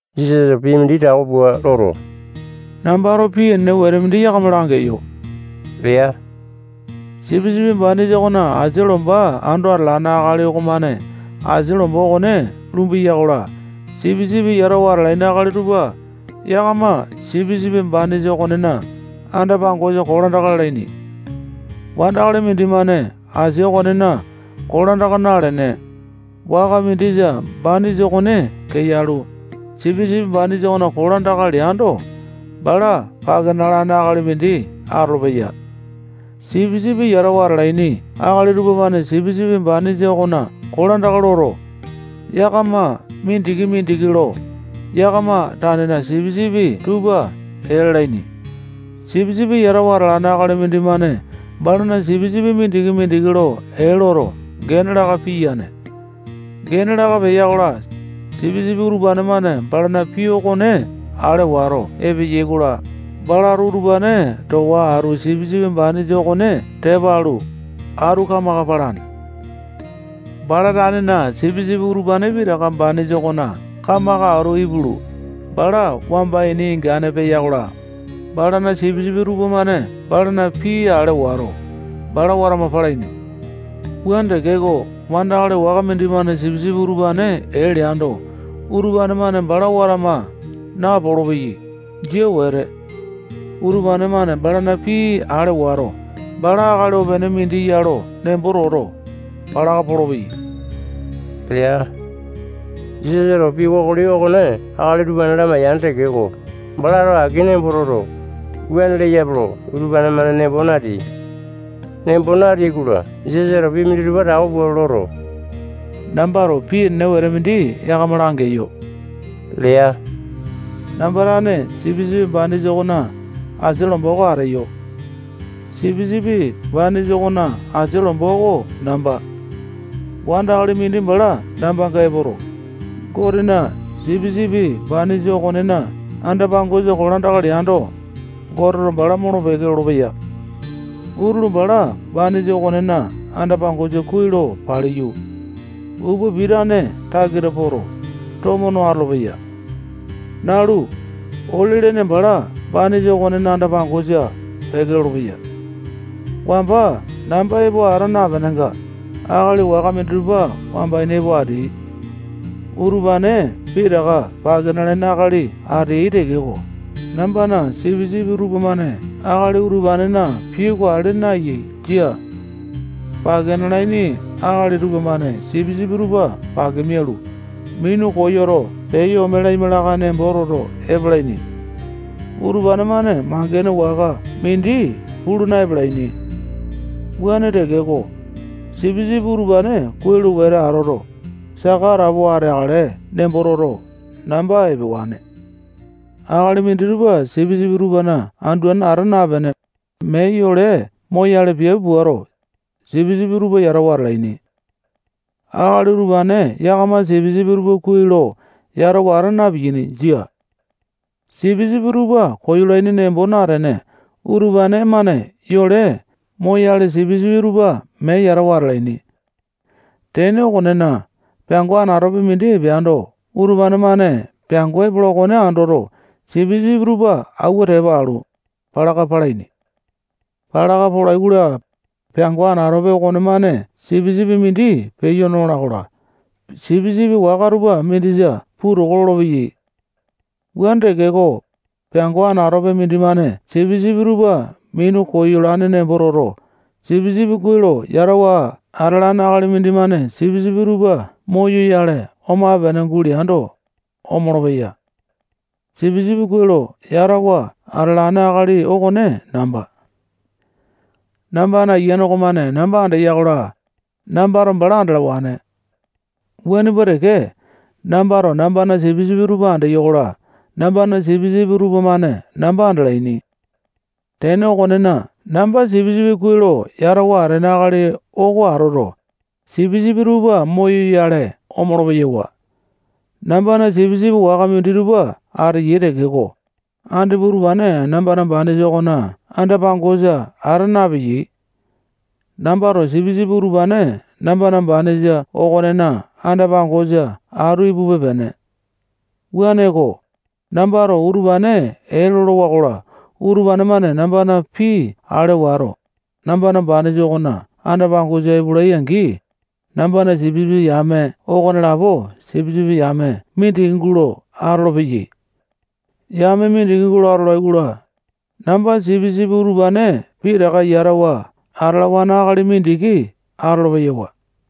Jisasato pii mindi tako pua loto, nambato pii enene wete mindi yakama langeyo lea. Sipisipi banisa okona asia lomba ando atalane akali okomane asia lomba okone lumbeya-kola, sipisipi yatawa atalaini akali tupa yakama sipisipi banisa okonena anda-pangosa kolandaka lalaini. Wandakali mindimane asia okonena kolandaka nalene, waka mindisa banisa okone keyalu, sipisipi banisa okona kolandaka leando, bala pake nalane akali mindi atolopeya. Sipisipi yatawa atalaini akali tupamane sipisipi banisa okona kolandaka loto, yakama mindiki-mindiki lo yakama tanena sipisipi tupa ee lalaini. Sipisipi yatawa atalane akali mindimane balana sipisipi mindiki-mindiki lo ee loto, gene laka piyane. Gene laka peya-kola, sipisipi utupane-mane balana pii okone ale wato epeyai-kola, balato utupane towa atu sipisipi banisa okone tepa alu, atu kamaka palane. Bala tanena sipisipi utupane pitaka banisa okona kamaka atu ipulu, bala wamba ini ingane peya-kola, balana sipisipi tupamane balana pii ale wato, bala watama palaini. Wuane tekeko, wandakali waka mindimane sipisipi utupane ee leando, utupane-mane bala watama napolo-peyai. Jia wete. Utupane-mane balana pii ale wato, bala akali opene mindi ya lo nembo toto, palaka polopeyai lea. Jisasato pii kokoli okone akali utupane lamaiya tekeko, balato aki nembo toto, wuane leyape lo utupane-mane nembo nateai. Nembo nateai-kola, Jisasato pii minditupa tako pua loto, nambato pii enene wete mindi yakama langeyo lea. Namba tane sipisipi banisa okona asia lomba oko ateyo. Sipisipi banisa okona asia lomba oko namba. Wandakali mindi bala nambanga epoto, Gotena sipisipi banisa okonena anda-pangosa kolandaka leando, Goteto bala molo-peke lolopeya. Utulu bala banisa okonena anda-pangosa kuai lo paliyu, upa pitane takita poto, tomo no atolopeya. Nalu, ole lene bala banisa okonena anda-pangosa peke lolopeya. Wamba namba epo ata napenenga, akali waka minditupa wamba ini epo ateai. Utupane pitaka pake nalaini akali ateyai tekeko, nambana sipisipi tupamane akali utupanena pii oko ale naeyai. Jia. Pake nalaini akali tupamane sipisipi tupa pake mialu, minu koyoto, peyo ome lamakale nembo toto epalaini. Utupane-mane mangene waka mindi pulu na-epalaini. Wuane tekeko, sipisipi utupane kuai lo wete atoto, saka atapowa ateakale nembo toto, namba epewane. Akali minditupa sipisipi tupana anduane ata napene, mee yole moyale piape puato, sipisipi tupa yatawa atalaini. Akali utupane yakamato sipisipi tupa kuai lo yatawa ata na-piyaini. Jia. Sipisipi tupa koyolaini nembo natene, utupane-mane yole moyale sipisipi tupa mee yatawa atalaini. Tene okonena, peango anatope mindi epeando, utupane-mane peango epola okone andoto, sipisipi tupa awua tepa alu, palaka palaini. Palaka polai-kola, peango anatope okonemane sipisipi mindi peyo nola-kola, sipisipi waka tupa mindisa puu toko lolopeyai. Wuane tekeko, peango anatope mindimane sipisipi tupa minu koyolane nembo toto, sipisipi kuai lo yatawa atalane akali mindimane sipisipi tupa moyoyale omape-pene guleando, omolo-peya. Sipisipi kuai lo yatawa atalane akali okone namba. Nambana ayiane okomane namba andeya-kola, nambato bala andalawane. Wuane pua teke, nambato nambana sipisipi tupa andeyo-kola, nambana sipisipi tupamane namba andalaini. Tene okonena, namba sipisipi kuai lo yatawa atene akali oko atoto, sipisipi tupa moyoyale omolo-peyawa. Nambana sipisipi waka minditupa ateyai tekeko, andipa utupane nambana banisa okona anda-pangosa ata napeyai. Nambato sipisipi utupane nambana banisa okonena anda-pangosa atu ipupe-pene. Wuaneko, nambato utupane ee lolowa-kola, utupane-mane nambana pii ale wato, nambana banisa okonena anda-pangosa epolai-angi, nambana sipisipi yame okonelapo sipisipi yame mindiki gulo atolopeyai. Yame mindiki atolai-kola, namba sipisipi utupane pitaka yatawa atalawane akali mindiki atolo-peyawa.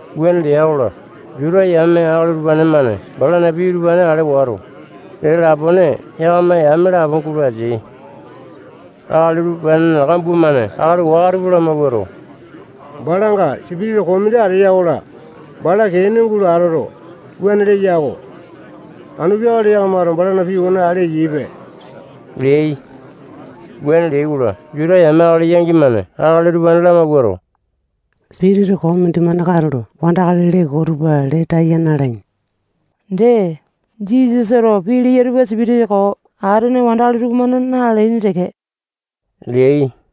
Wuane lea-kola, Juta yame akali utupane-mane balana pii utupane ale wato, dee lapone yakama yame lapo gulo ateai. Akali utupanena kambua-mane akali waka tupa lamawuato, balanga sipitisa koo mindi ateya-kola, bala kee ene gulo atoto, wuane leya-ko. Anu peakale yakamato balana pii okone ale eyaipe leai. Wuane leai-kola, Juta yame akali yangi-mane akali utupane lamawuato, sipitisa koo mindimane katulo wandakali lee koo tupa lee taya na-alaini. Dee, Jisasato pii leya utupa sipitisa koo atene wandakali tupamane na-lalaini teke leai.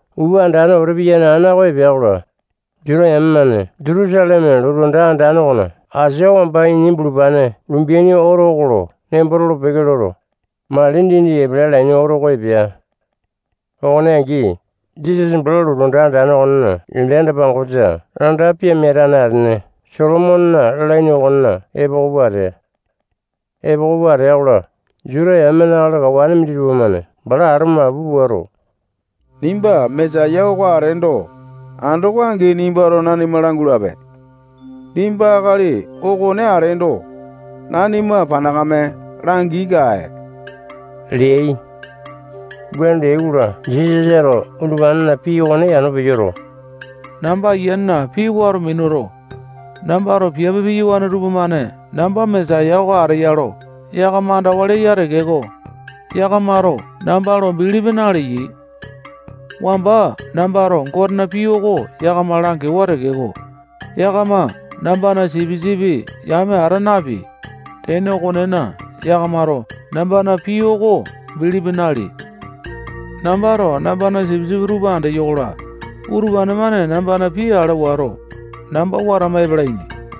Upa andane wete piyane ana oko epea-kola, Juta yame-mane Jutusaleme lotu anda andane okona asia wamba ini bulupane lumbeaini oto oko lo nembo tolo-peke loto, mali dindi epele alaini oto oko epea. Okone angi, Jisasa bala lotu anda andane okonena ende anda-pangosa anda pimia atane atene Solomonena lalaini okona epoko pua atea. Epoko pua atea-kola, Juta yamena akali kawane minditupa-mane bala ato mapu puato, nimba Mesaya oko ateendo, andoko angi nimbato nanima langulape. Nimba akali okone ateendo, nanima panakame langi-kae leai. Wuane leai-kola, Jisasato utupanena pii okone yano peyoto, namba Ayianena pii wato minuto, nambato piape piyawane tupamane namba Mesaya oko ateya lo yakama andawa leya tekeko, yakamato namba lo bilipi naleyai. Wamba nambato Gotena pii oko yakama langewa tekeko, yakama nambana sipisipi yame ata nepeai. Tene okonena, yakamato nambana pii oko bilipi naleai. Nambato nambana sipisipi tupa andeyo-kola, utupane-mane nambana pii ale wato, namba watama epalaini.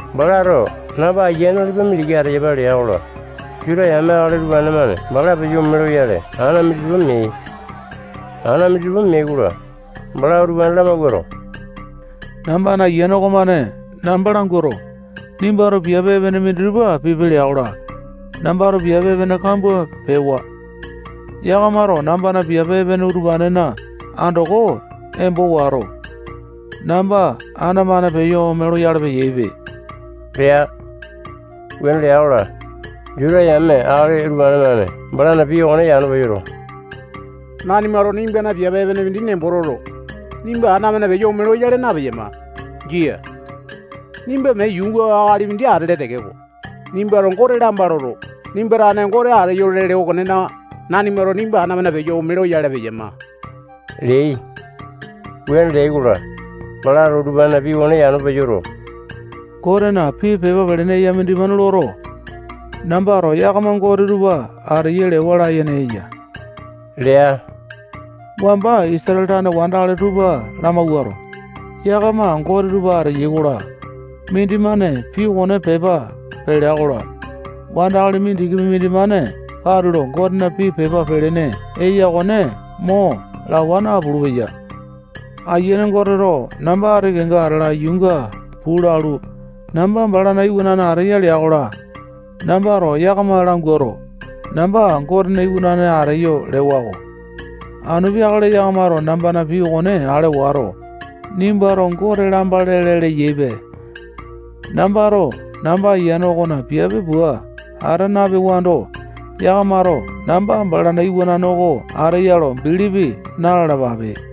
Balato namba Ayiane nalipa mindiki ateyapa lea-kola, Juta yame akali utupane-mane bala peyo ome loyale ana minditupa meai. Ana minditupa meai-kola, balato utupane lamawuato, nambana Ayiane okomane namba languato, nimbato piape epene minditupa pipe lea-kola, nambato piape epene kambua pewa. Yakamato nambana piape epene utupanena andoko embo wato, namba ana-mane peyo ome loyale peyaipe lea. Wuane lea-kola, Juta yame akali utupane-mane balana pii okone yano peyoto, nanimato nimbana piape epene mindi nembo toto, nimba ana-mane peyo ome loyale napeyama. Jia. Nimba mee yuunga akali mindi atele tekeko, nimbato Gote lamba loto, nimba tane Gote ateyo lele okonena, nanimato nimba ana-mane peyo ome loyale peyama leai. Wuane leai-kola, balato utupanena pii okone yano peyoto, Gotena pii pepa pelene eya mindimane loto, nambato yakama Gote tupa ateyai lewa layene eya lea. Wamba Goteto Isatale tane wandakali tupa lamawuato, yakama Gote tupa ateyai lea-kola, mindimane pii okone pepa pelea-kola, wandakali mindikipi mindimane katulo Gotena pii pepa pelene eya okone mo lawa napulu-peya. Ayiane Goteto namba ati kenga atala yuunga puu lalu, namba balana Iwanane ateya lea-kola, nambato yakama languato, namba Gotena Iwanane ateyo lewa-ko. Anu peakale yakamato nambana pii okone ale wato, nimbato Gote lamba lele leyaipe. Nambato namba Ayiane okona piape pua ata napewando, yakamato namba balana Iwanane oko ateya lo bilipi na-lalapape.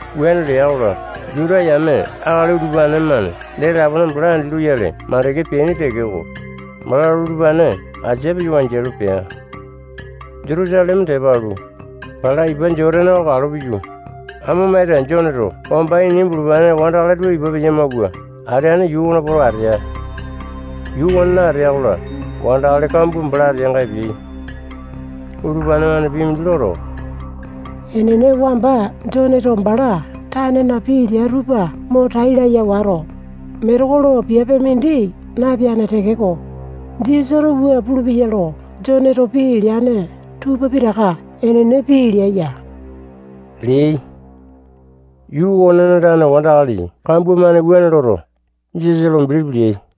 Wuane lea-kola, Juta yame akali utupane-mane dee lapone bala andi loyale makande peaini tekeko, balato utupane asia peyo wanjialu pea. Jutusaleme tepa alu, bala ipa Jotane oko kalo piyu, amo maita Joneto wamba ini bulupane wandakali tupa ipa peya-mauwa ateane yuu okona poto, atea. Yuu okonena atea-kola, wandakali kambua bala ateanga epeai. Utupane-mane pii mindi loto, enene, wamba Joneto bala tanena pii lea tupa mo tai laya wato, metekolo piape mindi napeane tekeko, Jisasato wua pulupeya lo Joneto pii leane tupa pitaka enene pii lea ya leai. Yuu okonena tane wandakali kambua-mane wuane loto, Jisasa lo bilipi leai.